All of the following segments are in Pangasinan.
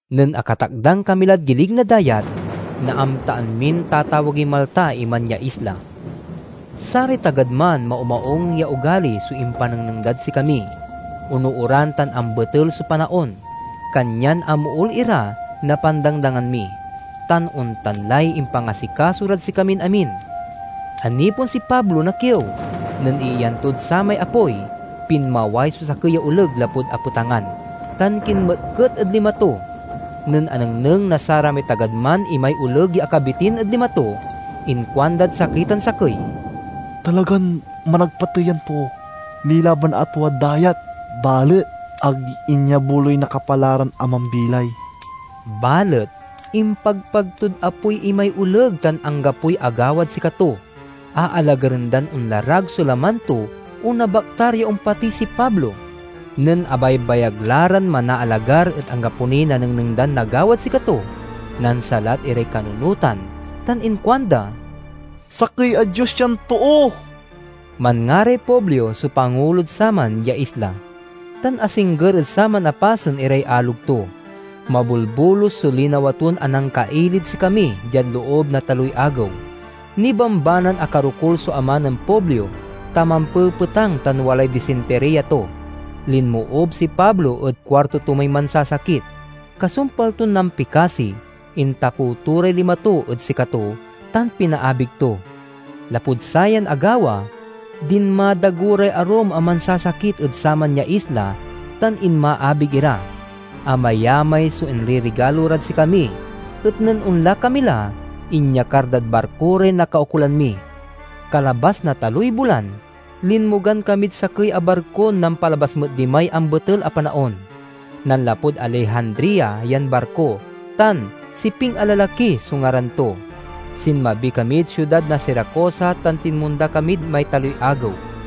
Nen akatakdang kami lad gilig na dayat, naamtaan min tatawagey Malta iman ya isla. Saray tagad man maumaung ya ogali so impanengneng dad sikami. Onooran tan ambetel so panaon, kanyan amool ira na pandangdangan mi, tan ontan lay impangasikaso rad sikamin amin. Anipon si Pablo na kiew. Nen iiyan tod samay apoy, pinmaway so sakey ya oleg lapud apetangan, tan kinmetket ed lima to. Nen anengneng na saramay tagad man imay oleg ya akabitin ed lima to, inkuandad sakey tan sakey, "Talagan managpatey yan too. Nilaban a tuad dayat, balet ag inyabuloy na Kapalaran a mambilay." Balet impagpag tod apoy imay oleg tan anggapoy agawad sikato. Aalagaren dan onlarag so laman to o nabaktar ya ompatey si Pablo. Nen abaybagay la ran manaalagar et anggapo niy nanengneng dan nagawad sikato, nansalat iray kanunotan tan inkuanda, "Sakey a dios yan too!" Manngaray Publio so pangulod saman ya isla, tan asingger ed saman a pasen iray alog to. Mabolbolus so linawa ton anangkailid sikami diad loob na taloy agew. Nibambanan akarokul so ama nen Publio, ta mampepetang tan walay disintiriya to. Linmoob si Pablo ed kuarto to may mansasakit. Kasumpal ton nampikasi, intapew to ray lima to ed sikato, tan pinaabig to. Lapud sayan agawa, dinmadago ray arum a mansasakit ed saman ya isla, tan inmaabig ira. Amayamay so inririgalo rad sikami, et, nen onla kami la, inyakar dad barko ray nakaukolan mi. Kalabas na taloy bulan, linmogan kamid sakey a barkon nampalabas met dimay ambetel a panaon. Nanlapud Alejandria yan barko, tan "Siping a Lalaki" so ngaran to. Sinmabi kamid siudad na Siracusa tan tinmonda kamid may taloy agew.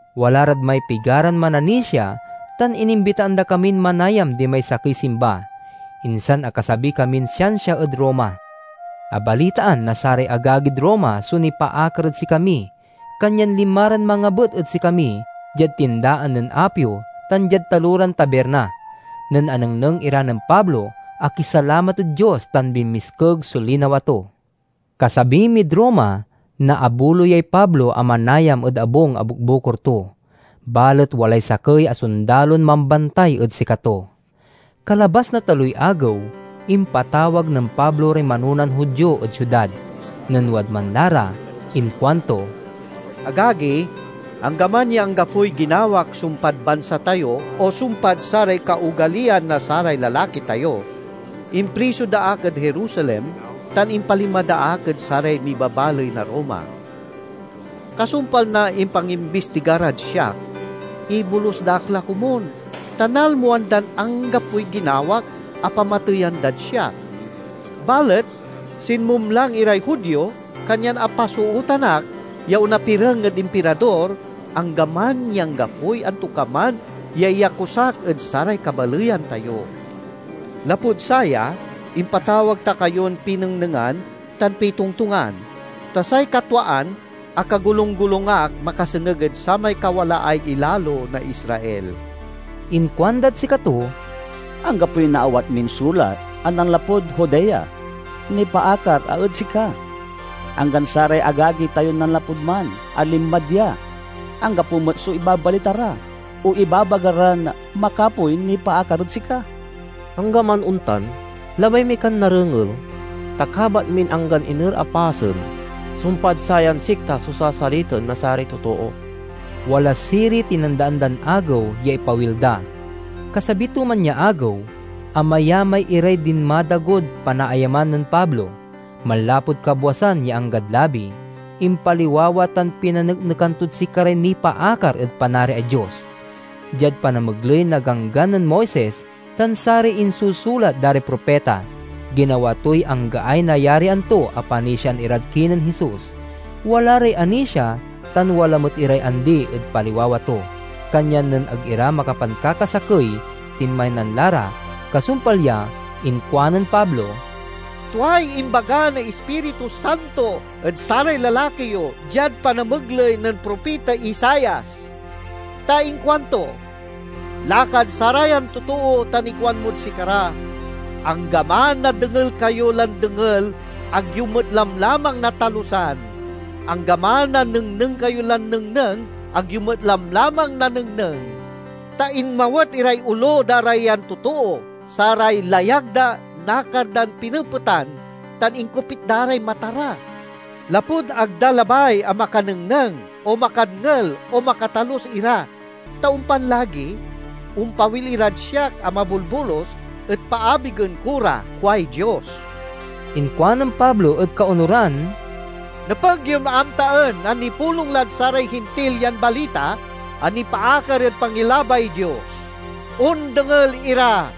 Wala rad may pigaran mananisia, tan inimbitaan da kamin manayam dimay sakey simba. Insan akasabi kamin siansia ed Roma. Abalitaan na saray agagid Roma so nipaakar ed sikami, kanyan linma ran mangabet ed sikami diad Tindaan nen Apio tan diad Taloran Tabirna. Nen anengneng ira nen Pablo, akisalamat ed Dios, tan binmiskeg so linawa to. Kasabi mid Roma, naabuloyay Pablo a manayam ed abung a bukbukor to, balet walay sakey a sondalon mambantay ed sikato. Kalabas na taloy agew, impatawag nen Pablo ray manonan Judio ed siudad. Nen wadman la ra inkuanto, "Agagi, anggaman ya anggapoy ginawak sumpad bansa tayo, o sumpad saray kaogaliyan na saray lalaki tayo, impriso da ak ed Jerusalem tan impalima da ak ed saray mibabaley na Roma. Kasumpal na impangimbistiga rad siak, ibolus da ak la komun, ta nalmoan dan anggapoy ginawak a pamateyan dad siak. Balet sinmumlang iray Judio, kanyan apasootan ak ya onapireng ed Impirador, anggaman ya anggapoy antokaman ya iyakusak ed saray kabaleyan tayo. Lapud saya, impatawag ta kayon pinengnengan tan pitongtongan; ta say katwaan akagolunggolung ak makasengeg ed samay kawalaay ilalo na Israel." Inkuandad sikato, "Anggapoy naawat min sulat a nanlapud Judea nipaakar a ed sika. Anggan saray agagi tayon nanlapud man a linma dia anggapo met so ibabalita ra o ibabaga ran makapoy nipaakar ed sika. Anggaman ontan, labay mi kan narengel, ta kabat min anggan iner a pasen, sumpad sayan sikta so sasalitaen na saray totoo." Wala siriy tinandaan dan agew ya ipawil da. Kasabi to man ya agew, amayamay iray dinmadagod panaayaman nen Pablo. Manlapud kabwasan ya anggad labi, impaliwawa tan pinaneknekan tod sikaray nipaakar ed Panariay Dios. Diad panamegley na Ganggan nen Moises tan saray insusulat da ray propita, ginawa toy anggaay nayarian to a panisiaen irad kinen Jesus. Wala ray anisia, tan wala met iray andi, ed paliwawa to. Kanyan nen ag ira makapankakasakey tinmaynan la ra, kasumpal ya inkuanen Pablo, "Tuay imbaga na Ispiritu Santo ed saray lalaki yo diad panamegley nen propita Isaias! Ta inkuanto, 'Lakad sarayan totoo tan ikuanmod sikara: Anggaman a dengel kayo lan dengel ag yo met lamlamang natalusan; anggaman a nengneng kayo lan nengneng, ag yo met lamlamang nanengneng. Ta inmawet iray olo da ra yan totoo, saray layag da nakar dan pinepetan, tan inkopit da ray mata ra. Lapud ag da labay a makanengneng, o makadngel o makatalus ira. Ta ompan lagi ompawil irad siak a mabolbolus, et paabigen ko ra—kuay Dios.'" Inkuanen Pablo ed kaonuran, "Nepeg yon amtaen a nipulong lad saray Hintil yan balita a nipaakar ed pangilabay Dios. Ondengel ira!"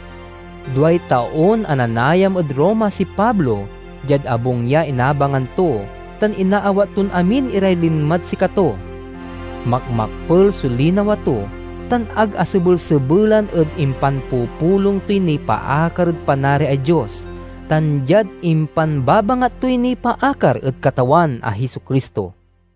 Duay taon a nanayam ed Roma si Pablo diad abung ya inabangan to tan inaawat ton amin iray linmad sikato. Makmakpel so linawa to tan ag asebelsebelan ed impanpupulong toy nipaakar ed Panariay Dios tan diad impanbabangat toy nipaakar ed Katawan a Jesu-Cristo.